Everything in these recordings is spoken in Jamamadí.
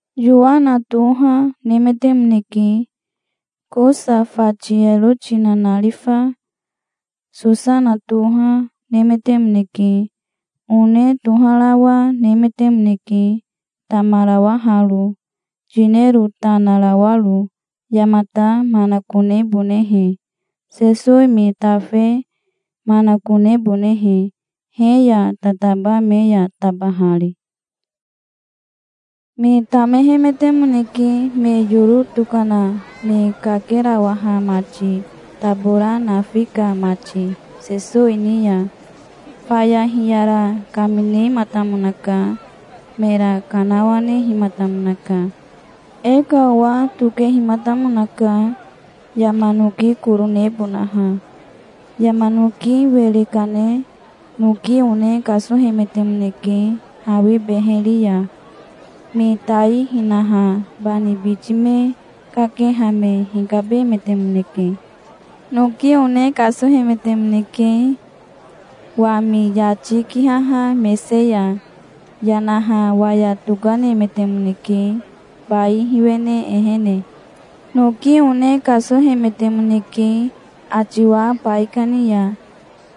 Yowana toha, nemetemoneke, Kosa fati, Eroti nanarifa. Sosana toha, nemetemoneke. One toharawa, nemetemoneke tamarawaharo, yinero ta narawaro, yamata manakonebonehe, Sesowi me tafe manakonebonehe, he ya tataba me ya tabahari. Me tamehemetemoneke me yoro tokana me kakerawaha mati tabora nafi ka mati Sesowi ni ya. Faya hiyara kaminematamonaka. Mera kanawanehimatamonaka. "E ka owa tokehimatamonaka yama noki koro nebonaha. Yama noki were kane noki one kasohemetemoneke hawi beheri ya. Me tai hinaha bani biti me kakeha me hikabemetemoneke. Noki one kasohemetemoneke wami yati kihaha mese ya. Yanaha waya tokanemetemoneke bai hiwene ehene. Noki one kasohemetemoneke atiwa baikani ya.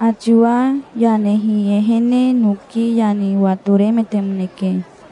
Atiwa yanehi ehene noki yani watoremetemoneke.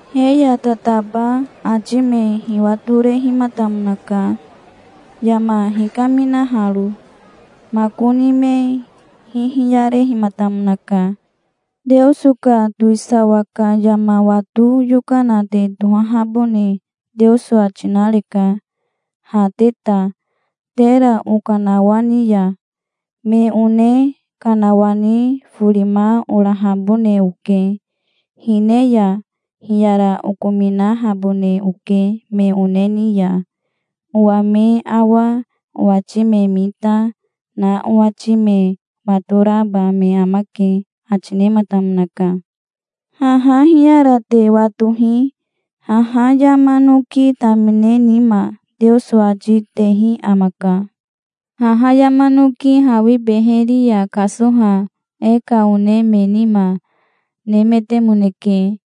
He ya tataba ati me hiwatorehimatamonaka, yama hikaminaharo. Makoni me hihiyarehimatamonaka. "Teoso ka towisawa ka yama wato yokana te tohahabone Teoso ati nareka, ha te ta, tera okanawani ya. Me one kanawani forima orahabone oke. Hine ya hiyara okominahabone oke me one ni ya. Owa me awa, owati me mita, na owati me watoraba me amake", ati nematamonaka. "Haha hiyara te watohi. Haha yama noki tamine nima Teoso ati tehi amaka. Haha yama noki hawi beheri ya kasoha e ka one me nima nemetemoneke,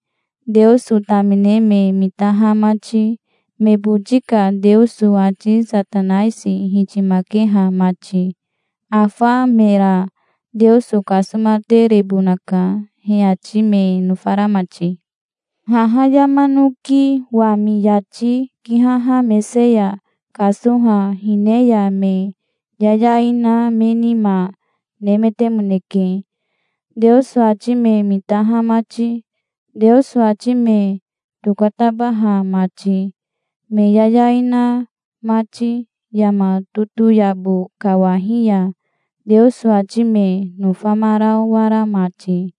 Teoso tamine me mitaha mati, me boti ka Teoso ati Satanaisi hitimakeha mati. Afa mera Teoso kasomaterebonaka, he ati me nofara mati. Haha yama noki wami yati kihaha mese ya kasoha hine ya me yayai na me nima nemetemoneke, Teoso ati me mitaha mati, Teoso ati me tokatabaha mati, me yayai na mati, yama totoyabo kawahi ya Teoso ati me nofamarawara mati,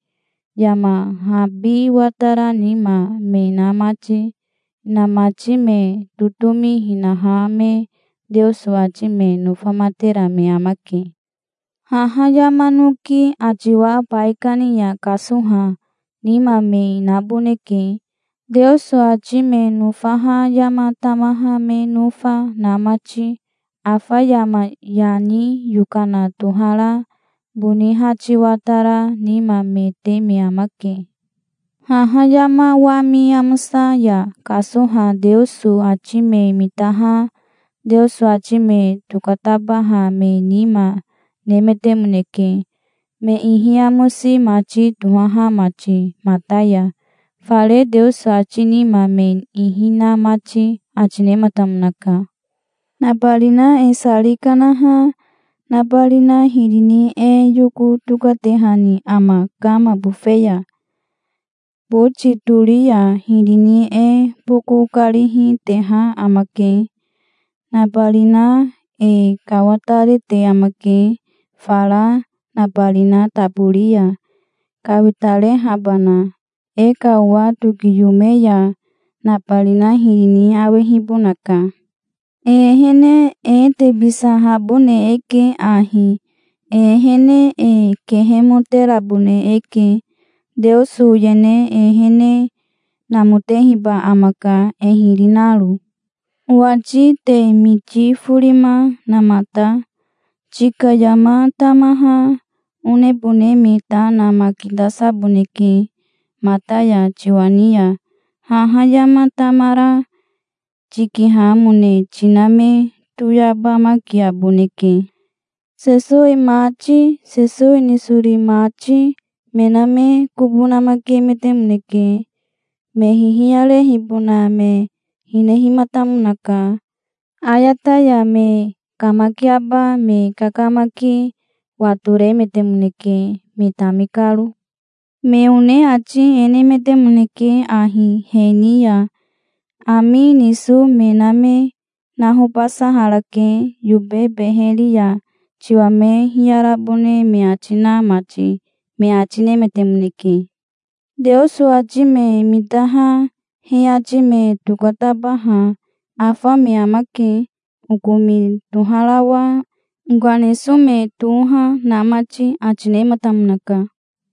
yama habi watara nima me na mati. Inamati me totomi hinaha me Teoso ati me nofamatera me amake. Haha yama noki atiwa baikani ya kasoha nima me naboneke, Teoso ati me nofaha yama tamaha me nofa na mati. Afa yama yani yokana tohara boni hati watara nima me te me amake. Haha yama wami amosa ya kasoha Teoso ati me mitaha Teoso ati me tokatabaha me nima nemetemoneke, me ihi amosi mati tohaha mati mata ya, fare Teoso ati nima me ihi na mati", ati nematamonaka. "Nabarina e sari kanaha nabarina hiri ni e yoko tokatehani ama kama bofe ya? Boti tori ya hiri ni e boko karihi teha amake. Nabarina e kawatarete amake fara nabarina tabori ya kawitarehabana. E ka owa tokiyome ya nabarina hiri ni awehibonaka. E ehene e tebisahabone eke ahi. E ehene e kehemoterabone eke. Teoso oyene e ehene namotehiba amaka, e hiri naro. Owati te miti forima namata. Tika yama tamaha onebone me ta namakitasaboneke mata ya tiwa ni ya. Haha yama tamara tikihamone tina me toyabamakiaboneke". Sesowi mati Sesowi nisori mati me na me kobo namakiemetemoneke. Me hihiyarehibona me hinehimatamonaka. Ayata ya me kamakiaba me kakamaki watoremetemoneke, me tami karo. Me one ati e nemetemoneke ahi he ni ya: "Ami niso me na me nahobasaharake yobe beheri ya, tiwa me hiyarabone me ati na mati", me ati nemetemoneke. "Teoso ati me mitaha he ati me tokatabaha afa me amake, okomi toharawa, okaniso me toha na mati", ati nematamonaka.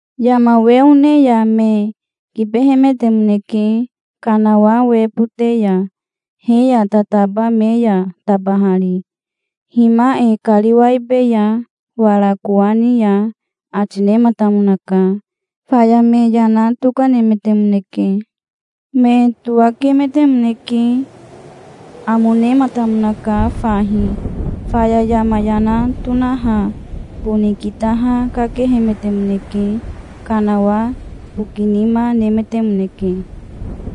Yama we one ya me kibehemetemoneke kanawa webote ya, he ya tataba me ya tabahari. "Hima e kariwaibeya wara kowani ya", ati nematamonaka. Faya me yana tokanemetemoneke. Me towakemetemoneke. Amo nematamonaka fahi. Faya yama yana tonaha boni kitaha kakehemetemoneke. Kanawa bokinima nemetemoneke.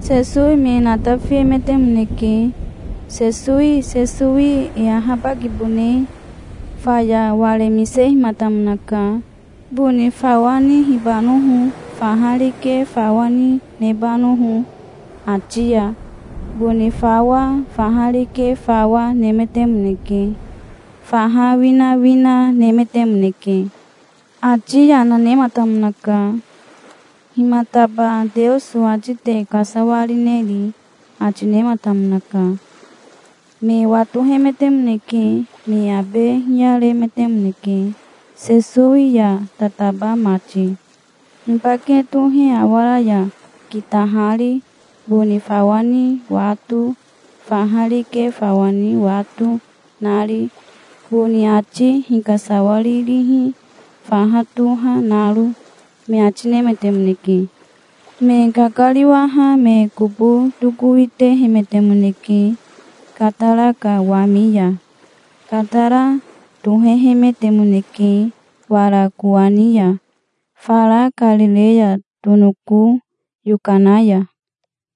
Sesowi me natafiemetemoneke. "Sesowi, Sesowi, e ahabakibone". Faya waremisehimatamonaka, boni fawa nihibanoho, faha rike fawa ni, nebanoho, ati ya. Boni fawa, faha rike fawa, nemetemoneke. Faha winawina nemetemoneke. Ati yana nematamonaka. "Himataba Teoso ati te kasawarineri?" ati nematamonaka. Me watohemetemoneke. Me abe hiyaremetemoneke, Sesowi ya tataba mati. "Hibake tohe awaraya, kitahari, boni fawa ni wato, faha rike fawa ni wato, nari, boni ati hikasawaririhi, faha toha, naro?" me ati nemetemoneke. Me kakariwaha me kobo tokowitehemetemoneke Katara ka wami ya. Katara tohehemetemoneke wara kowani ya, fara Karireya tonoko yokana ya.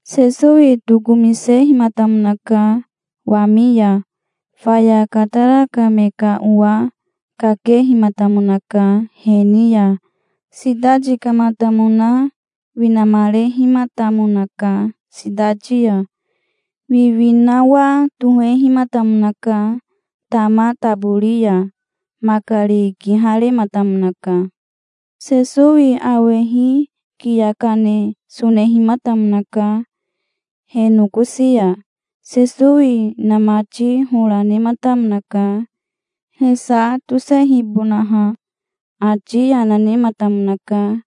Sesowi tokomisehimatamonaka wami ya. Faya Katara ka me ka owa kakehimatamonaka he ni ya. Sitati kamatamona winamarehimatamonaka sitati ya. Wiwinawa tohehimatamonaka tama tabori ya. Makari kiharematamonaka. Sesowi awehi kiya kane sonehimatamonaka he nokosi ya. Sesowi inamati hora nematamonaka, he sa tosehibonaha. Ati yana nematamonaka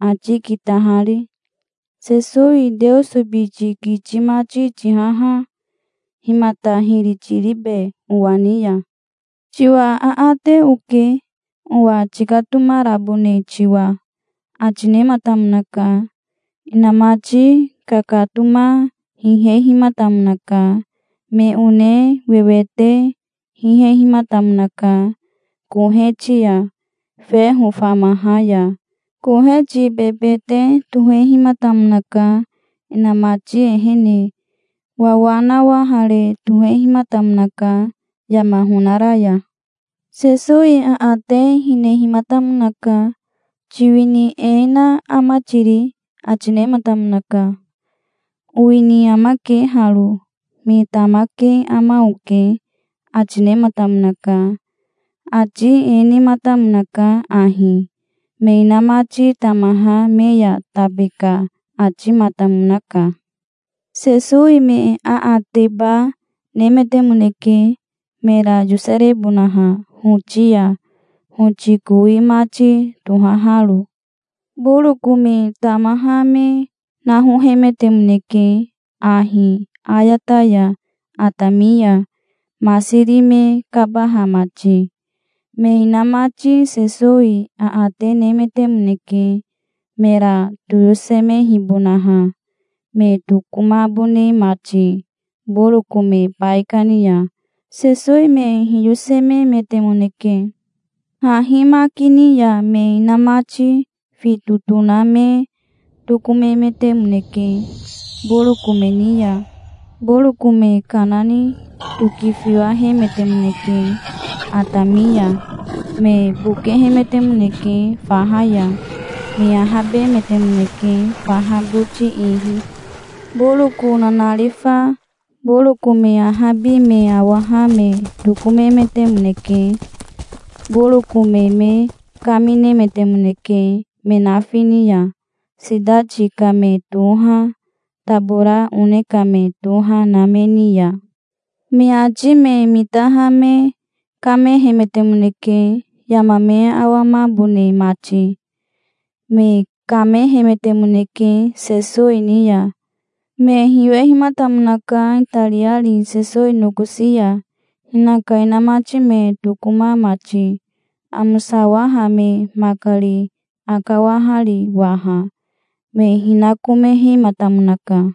ati kitahari. "Sesowi Teoso biti kiti mati tihaha himata hiri tiribe owa ni ya? Tiwa aate oke, owa tikatomarabone tiwa", ati nematamonaka. Inamati kakatoma hihehimatamonaka. Me one wewete hihehimatamonaka, koheti ya feho famaha ya. Koheti bebete tohehimatamonaka. Inamati ehene wawa nawahare tohehimatamonaka yama honara ya. Sesowi aate hinehimatamonaka. "Tiwini e na ama tiri?" ati nematamonaka. "Owini amake haro, Me Tamake ama oke", ati nematamonaka. Ati e nematamonaka ahi, me inamati tamaha me ya tabe ka atimatamonaka. Sesowi me aate ba nemetemoneke mera yoserebonaha hoti ya, hoti kowi mati tohaharo. Boroko me tamaha me nahohemetemoneke ahi ayata ya atami ya masiri me kabaha mati. Me inamati Sesowi aate nemetemoneke mera toyosemehibonaha, me tokomabone mati boroko me baikani ya. Sesowi me hiyosememetemoneke. Hahi maki ni ya me inamati fito tona me tokomemetemoneke boroko me ni ya. Boroko me kana ni tokifiwahemetemoneke atami ya. Me bokehemetemoneke faha ya. Me ahabemetemoneke faha boti ihi. Boroko nanarifa boroko me ahabi me awaha me tokomemetemoneke. Boroko me me kaminemetemoneke me nafi ni ya, sitati ka me toha, tabora one ka me toha na me ni ya. Me ati me mitaha me kamehemetemoneke yama me awamabone mati. Me kamehemetemoneke Sesowi ni ya. Me hiwehimatamonaka itariari Sesowi nokosi ya, hinaka inamati me tokoma mati, amosawahame makari akawahari waha. Me hinakomehematamonaka.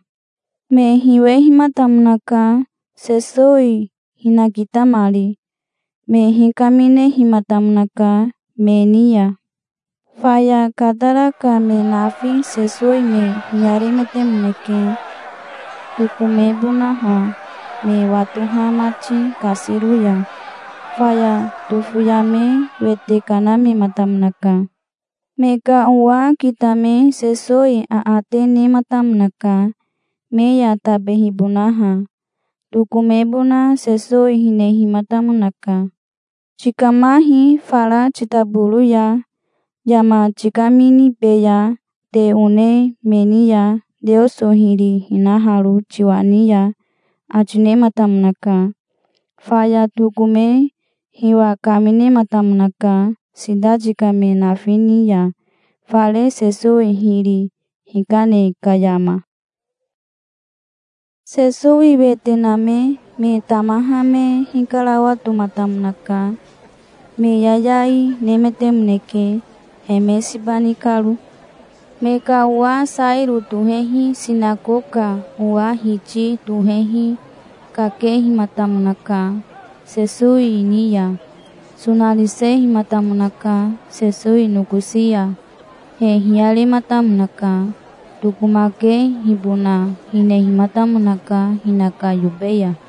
Me hiwehimatamonaka Sesowi hinakitamari. Me hikaminehimatamonaka me ni ya. Faya Katara ka me nafi Sesowi me hiyaremetemoneke, tokomebonaha me watoha mati kasiro ya. Faya tofoyame wete kanamematamonaka. Me ka owa kitame Sesowi aate nematamonaka, me ya tabehibonaha. Tokomebona Sesowi hinehimatamonaka. "Tikamahi fara titaboro ya. Yama tikaminibeya te one me ni ya Teoso hiri hinaharo tiwa ni ya", ati nematamonaka. Faya tokome hiwa kaminematamonaka sitati ka me nafi ni ya fare Sesowi hiri hikane ka yama. Sesowi wete name me tamaha me hikarawatomatamonaka. Me yayai nemetemoneke he me siba ni karo. Me ka owa Sairo tohehi sinakoka owa hiti tohehi kakehimatamonaka Sesowi ni ya. Sonarisehimatamonaka Sesowi nokosi ya. He hiyarematamonaka. Tokomakehibona hinehimatamonaka hinaka yobe ya.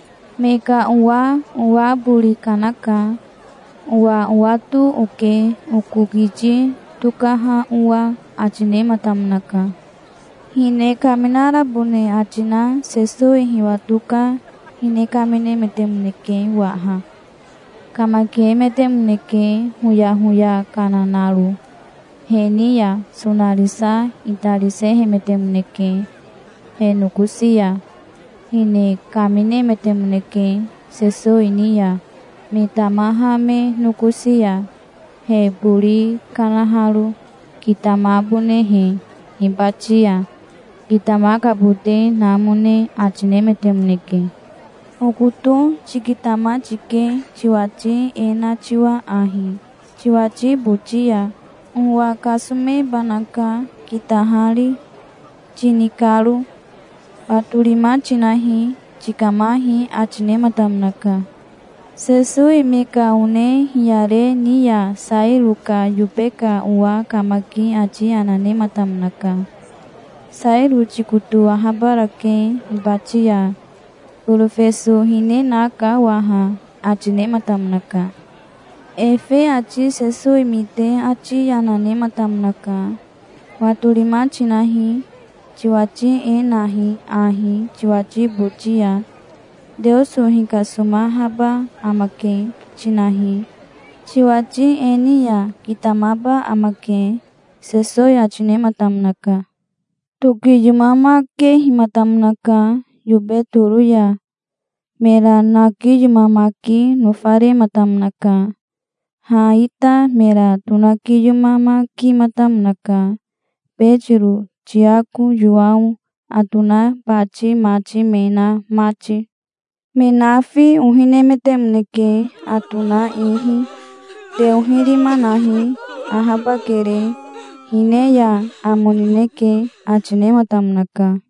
"Me ka owa owa bori kanaka. Owa owato oke oko kiti tokaha owa", ati nematamonaka. Hine kaminarabone ati na Sesowi hiwato ka hine kaminemetemoneke waha. Kamakiemetemoneke hoyahoya kana naro. He ni ya sonarisa itarisehemetemoneke he nokosi ya. Hine kaminemetemoneke Sesowi ni ya me tamaha me nokosi ya, he bori kanaharo, kitamabonehe. Hibati ya kitamakabote namone ati nemetemoneke. "Okoto tikitama tike tiwati e na tiwa ahi, tiwati boti ya, 'Owa kasomebanaka, kitahari', tini karo. Watorima tinahi. Tikamahi", ati nematamonaka. Sesowi me ka one hiyare ni ya Sairo ka yobe ka owa kamaki ati yana nematamonaka. "Sairo tikoto ahabarake hibati ya. Borofeso hine naka waha", ati nematamonaka. Efe ati Sesowi mite ati yana nematamonaka. "Watorima tinahi. Tiwati e nahi ahi tiwati boti ya: 'Teoso hikasomahaba amake', tinahi. Tiwati e ni ya kitamaba amake", Sesowi ati nematamonaka. Tokiyomamakehimatamonaka yobe toro ya. Mera nakiyomamaki nofarematamonaka. Ha ita mera tonakiyomamakimatamonaka Betiro, Tiako, Yowao, atona bati, mati, me na mati. Me nafi ohi nemetemoneke atona ihi. "Te ohi rima nahi. Ahabakere. Hine ya amo nineke", ati nematamonaka.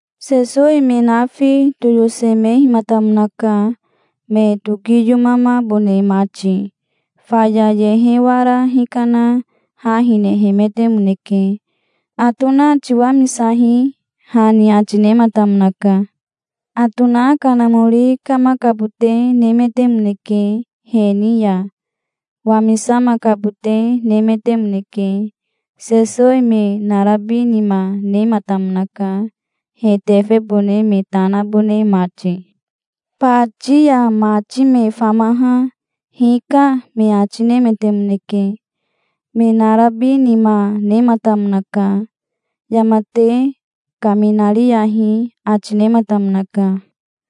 Sesowi me nafi toyosemehimatamonaka me tokiyomamabone mati. Faya yehe wara hikana ha hinehemetemoneke. "Atona tiwamisahi", ha ni ati nematamonaka. Atona kanamori kamakabote nemetemoneke he ni ya. Wamisamakabote nemetemoneke. Sesowi me narabi nima nematamonaka he tefebone me ta nabone mati. Bati ya mati me famaha "Hika", me ati nemetemoneke. Me narabi nima nematamonaka. "Yama te kamina riyahi", ati nematamonaka.